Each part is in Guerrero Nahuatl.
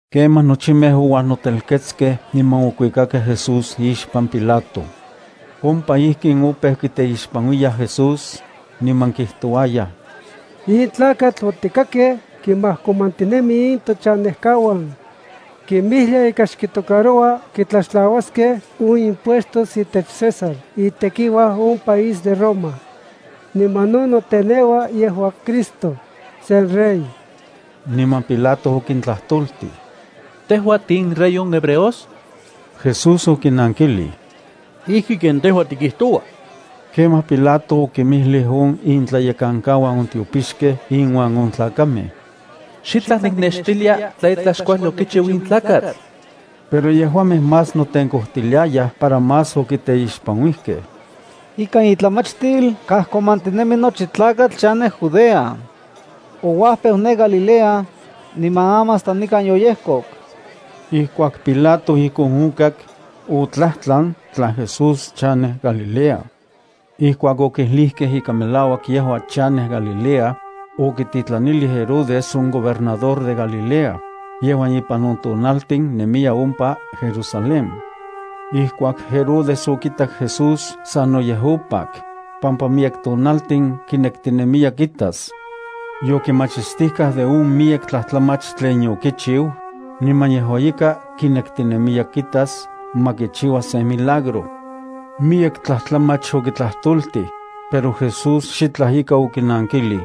Kemaj nochimej ouajnotelketskej niman okuikakej Jesús ixpan Pilato. Ompa ijkin opeu kiteixpanuiyaj Jesús, niman kijtouayaj: —In tlakatl otikakej kimajkomantinemi in tochanejkauan. Kimijlia ika xkitocaroua tiktlaxtlauaskej on impuestos itech César itekiuaj on país de Roma. Niman no noteneua yejua Cristo, sen rey. Niman Pilato okitlajtoltij: —¿Tejua tiinRey on hebreos? Jesús okinankilij: —Ijki ken tejua tikijtoua. Kemaj Pilato okinmijlij on intlayekankauan on tiopixkej inuan on tlakamej: —Xitlaj niknextilia tla itlaj xkuajli okichiu in tlakatl. Pero yejuamej más notenkojtiliayaj para más okiteixpanuijkej: —Ikan itlamachtil kajkomantinemi nochi tlakatl chanej Judea. Ouajpeu ne Galilea, niman aman hasta nikan yoyejkok. Ijkuak Pilato ijkon okak, otlajtlan tla Jesús chanej Galilea. Ijkuak okijlijkej ika melauak yejua chanej Galilea, okititlanilij Herodes on gobernador de Galilea, yejuan ipan on tonaltin nemiya ompa Jerusalén. Ijkuak Herodes okitak Jesús, sanoyej opak, pampa miyek tonaltin kinektinemiya kitas. Yokimachistijkaj de on miyek tlajtlamach tlen okichiu, niman yejua ika kinektinemiya kitas ma kichiua sen milagro. Miyek tlajtlamach okitlajtoltij, pero Jesús xitlaj ika okinankilij.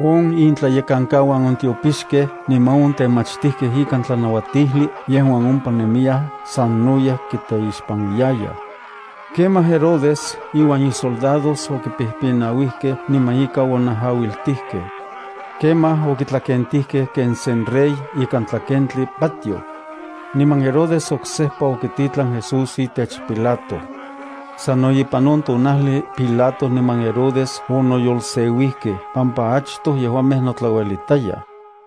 On intlayekankauan on tiopixkej niman on temachtijkej ikan tlanauatijli yejuan ompa nemiyaj sanoyej kiteixpanuiyayaj. Kemaj Herodes iuan isoldados okipijpinauijkej niman ika onajauiltijkej. Kemaj okitlakentijkej ken sen rey ikan tlakentli patioj. Niman Herodes oksejpa okititlan Jesús itech Pilato. Sano ipan on tonajli Pilato niman Herodes onoyolseuijkej pampa achtoj yejuamej notlauelitayaj.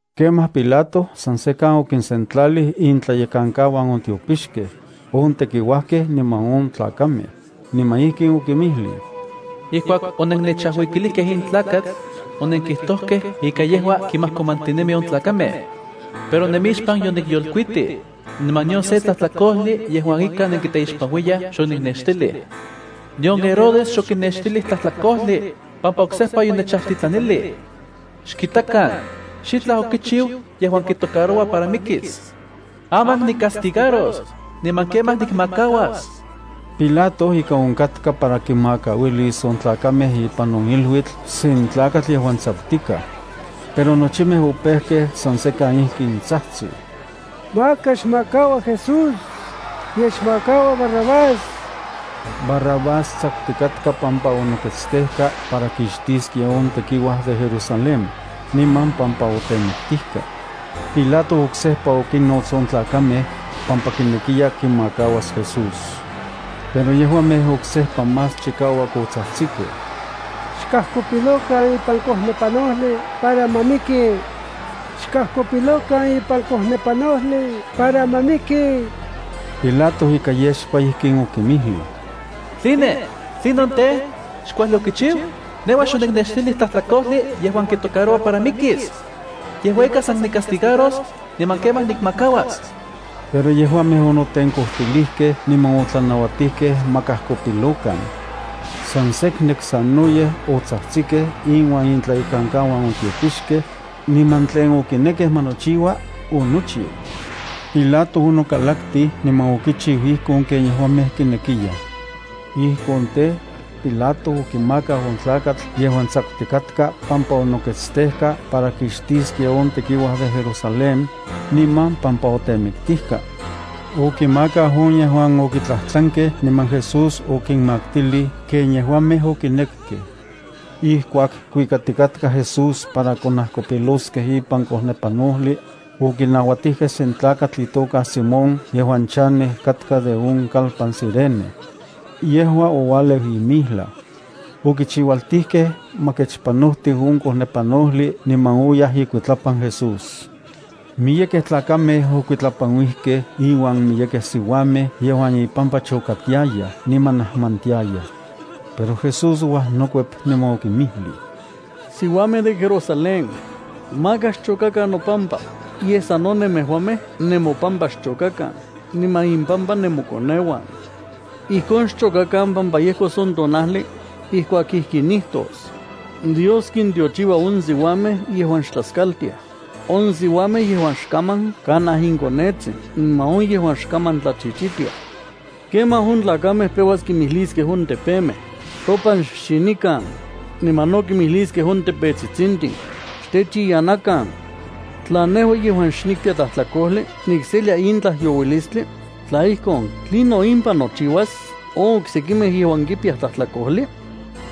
Kemaj Pilato san sekan okinsentlalij intlayekankauan on tiopixkej, on tekiuajkej niman on tlakamej, niman ijkin okinmijlij: —Ijkuak onennechajuikilijkej in tlakatl, onenkijtojkej ika yejua kimajkomantinemi on tlakamej. Pero nemixpan yonikyolkuitij, niman nion se tlajtlakojli yejuan ika nenkiteixpanuiyaj xoniknextilij. Nion Herodes xokinextilij tlajtlakojli, pampa oksejpa yonechajtitlanilij. Xkitakan, xitlaj okichiu yejuan kitocaroua para mikis. Aman nicastigaros, niman kemaj nikmakauas. Pilato ika onkatka para kinmakauilis on tlakamej ipan on iluitl sen tlakatl yejuan tsakutikaj. Pero nochimej opejkej san sekan ijkin tsajtsij: —¡Maka xmakaua Jesús, yej xmakaua Barrabás! (Barrabás tsakutikatka pampa onoketstejka para kixtiskia on tekiuaj de Jerusalén, niman pampa otemiktijka.) Pilato oksejpa okinnots on tlakamej, pampa kinekiya kimakauas Jesús. Pero yejuamej oksejpa más chikauak otsajtsikej: —¡Xkajkopilokan ipan kojnepanojli para ma miki! ¡Xkajkopilokan ipan kojnepanojli para ma miki! Pilato ika yexpa ijkin okinmijlij: —¿Tline? ¿Tlinon tej, xkuajli okichiu? Nejua xoniknextilij tlajtlakojli yejuan kitocaroua para mikis. Yejua ika san nicastigaros, niman kemaj nikmakauas. Pero yejuamej onotenkojtilijkej niman otlanauatijkej ma kajkopilokan. San seknek sanoyej otsajtsikej inuan intlayekankauan on tiopixkej, niman tlen okinekej ma nochiua, onochiu. Pilato onokalaktij niman okichiu ijkon ken yejuamej kinekiyaj. Ijkon tej, Pilato okimakau on tlakatl yejuan tsakutikatka pampa onoketstejka para kixtiskia on tekiuaj de Jerusalén, niman pampa otemiktijka. Okimakau on yejuan okitlajtlankej niman Jesús okinmaktilij ken yejuamej okinekkej. Ijkuak kuikatikatkaj Jesús para konajkopiloskej ipan kojnepanojli, okinauatijkej sen tlakatl itoka Simón yejuan chanej katka de on kalpan Cirene. Yejua oualeu ipan campo. Okichiualtijkej ma kechpajnotiu on kojnepanojli niman oyaj ikuitlapan Jesús. Miyekej tlakamej okuitlapanuijkej inuan miyekej siuamej yejuan ipampa chokatiayaj niman najmantiayaj. Pero Jesús ouajnokuep niman okinmijlij: —Siuamej de Jerusalén, maka xchokakan nopampa, yej sano nemejuamej nemopampa xchokakan niman impampa nemokoneuan. Ijkon xchokakan pampa yejkos on tonajli ijkuak ijkin nijtos: “Dios kintiochiua on siuamej yejuan xtlaskaltiaj, on siuamej yejuan xkaman kanaj inkonetsin niman on yejuan xkaman tlachichitiaj.” Kemaj on tlakamej peuas kimijliskej on tepemej: “Topan xxinikan”, niman no kimijliskej on tepetsitsintin: “Xtechiyanakan.” Tla nejua yejuan xnikpiya tlajtlakojli nikselia in tlajyouistli, tla ijkon, ¿tlinon impan nochiuas on oksekimej yejuan kipiyaj tlajtlakojli?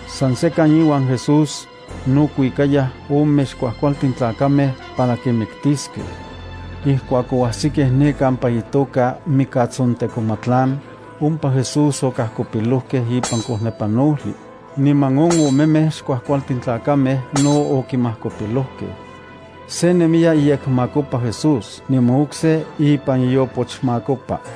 San sekan iuan Jesús no kuikayaj ome xkuajkualtin tlakamej para kinmiktiskej. Ijkuak oajsikej ne kampa itoka “Mikatsontekomatlan”, ompa Jesús okajkopilojkej ipan kojnepanojli, niman on omemej xkuajkualtin tlakamej no okinmajkopilojkej. Se nemiya iyekmakopa Jesús niman okse ipan iopochmakopa.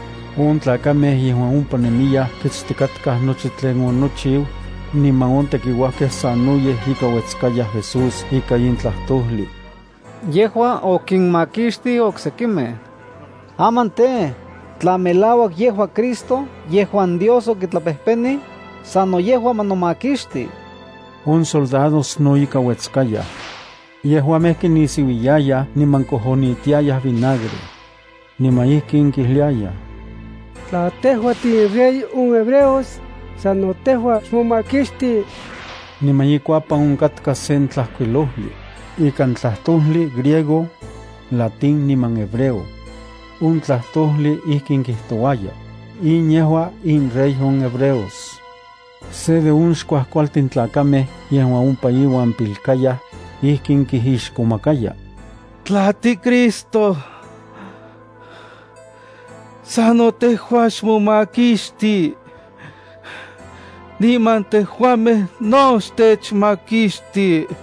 On tlakamej yejuan ompa nemiyaj kitstikatkaj nochi tlen onochiu, niman on tekiuajkej sanoyej ika uetskayaj Jesús ika in tlajtojli: —Yejua okinmakixtij oksekimej. Aman tej, tla melauak yejua Cristo yejuan Dios okitlapejpenij, sano yejua ma nomakixti. On soldados no ika uetskayaj. Yejuamej kinisiuiyayaj niman kojonitiayaj vinagre. Niman ijkin kijliayaj: —Tla tejua tiinRey on hebreos, sano tejua xmomakixti. Niman ikuapan onkatka sen tlajkuilojli, ikan tlajtojli griego, latín niman hebreo. On tlajtojli ijkin kijtouaya: “In yejua inRey on hebreos.” Se de on xkuajkualtin tlakamej yejuan ompa iuan pilkayaj, ijkin kijixkomakaya: —Tla tiCristo, sano tejua xmomakixti, niman tejuamej no xtechmakixti.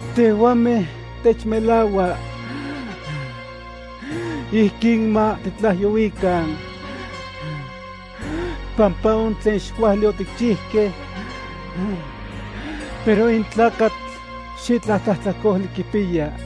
Tejuamej techmelaua ijkin ma titlajyouikan pampa on tlen xkuajli otikchijkej, pero in tlakatl xitlaj tlajtlakojli kipiya.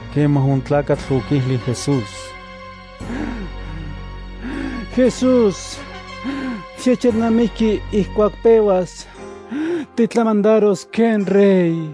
Kemaj on tlakatl okijlij Jesús: —Jesús, xnechelnamiki ijkuak peuas titlamandaros ken Rey.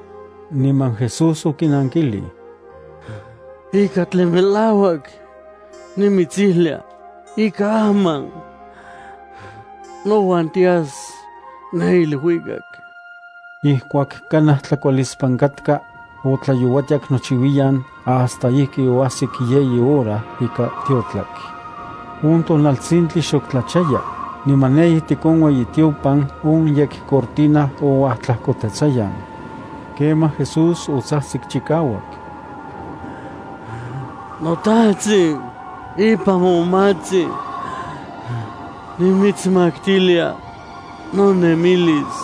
Niman Jesús okinankilij: —Ika tlen melauak nimitsijlia ika aman nouan tinemis ne iluikak. Ijkuak kanaj tlakualispan katka, otlayouatiak nochiuiyan hasta ijki oajsik yeyi hora ika tiotlak. On tonaltsintli xok tlachaya, niman ne ijtik on ueyitiopan on yekcortina ouajtlajkotetsayan. Kemaj Jesús otsajtsik chikauak: —NoTajtsin, ipan momatsin nimitsmaktilia nonemilis.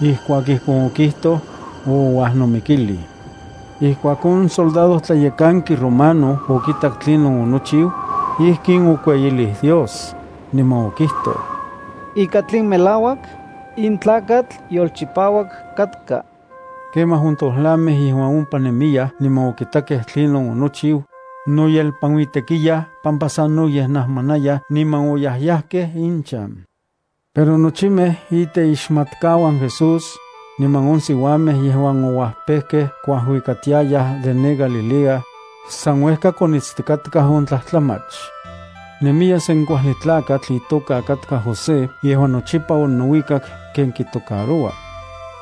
Ijkuak ijkon okijtoj, ouajnomikilij. Ijkuak on soldadojtlayekanki romano okitak tlinon onochiu, ijkin okueyilij Dios, niman okijtoj: —Ika tlen melauak, in tlakatl yolchipauak katka. Kemaj on tojlamej yejuan ompa nemiyaj niman okitakej tlinon onochiu, noyelpanuitekiyaj pampa sanoyej najmanayaj, niman oyajyajkej inchan. Pero nochimej iteixmatkauan Jesús, niman on siuamej yejuan ouapejkej kuajuikatiayaj de ne Galilea, san uejka konitstikatkaj on tlajtlamach. Nemiya sen kuajli tlakatl itoka katka José yejuan nochipa onouikak ken kitocaroua.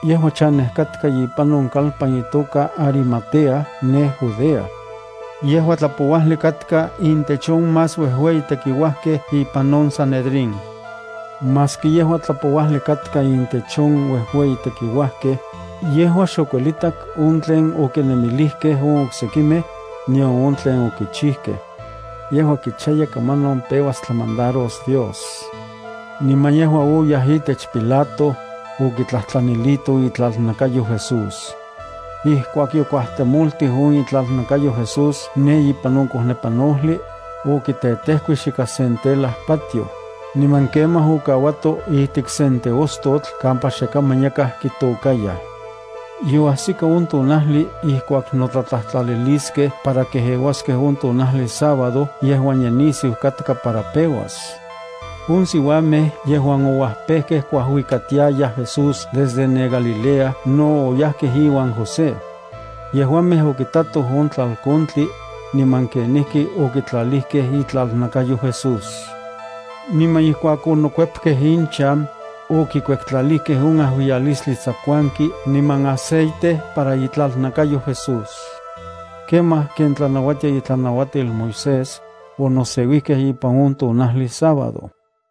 Yejua chanej katka ipan on kalpan itoka Arimatea ne Judea. Yejua tlapouajli katka intech on más uejueyi tekiuajkej ipan on Sanedrín. Maski yejua tlapouajli katka intech on uejueyi tekiuajkej, yejua xokuelitak on tlen okinemilijkej on oksekimej, nion on tlen okichijkej. Yejua kichaya kamanon peuas tlamandaros Dios. Niman yejua oyaj itech Pilato, okitlajtlanilito itlalnakayo Jesús. Ijkuak yokuajtemoltij on itlalnakayo Jesús ne ipan on kojnepanojli, okitetejkuix ikan sen tela patioj, niman kemaj okauato ijtik sen teostotl kampa xe kaman yakaj kitokayaj. Yoajsika on tonajli ijkuak notlatlajtlaliliskej para kejeuaskej on tonajli sábado yejuan ye nisiu katka para peuas. On siuamej yejuan ouajpekej kuajuikatiaya Jesús desde ne Galilea, no oyajkej iuan José. Yejuamej okitatoj on tlalkontli, niman kenijki okitlalijkej itlalnakayo Jesús. Niman ijkuak onokuepkej inchan, okikuektlalijkej on ajuiyalistli tsakuanki niman aceite para itlalnakayo Jesús. Kemaj ken tlanauatia itlanauatil Moisés, onoseuijkej ipan on tonajli sábado.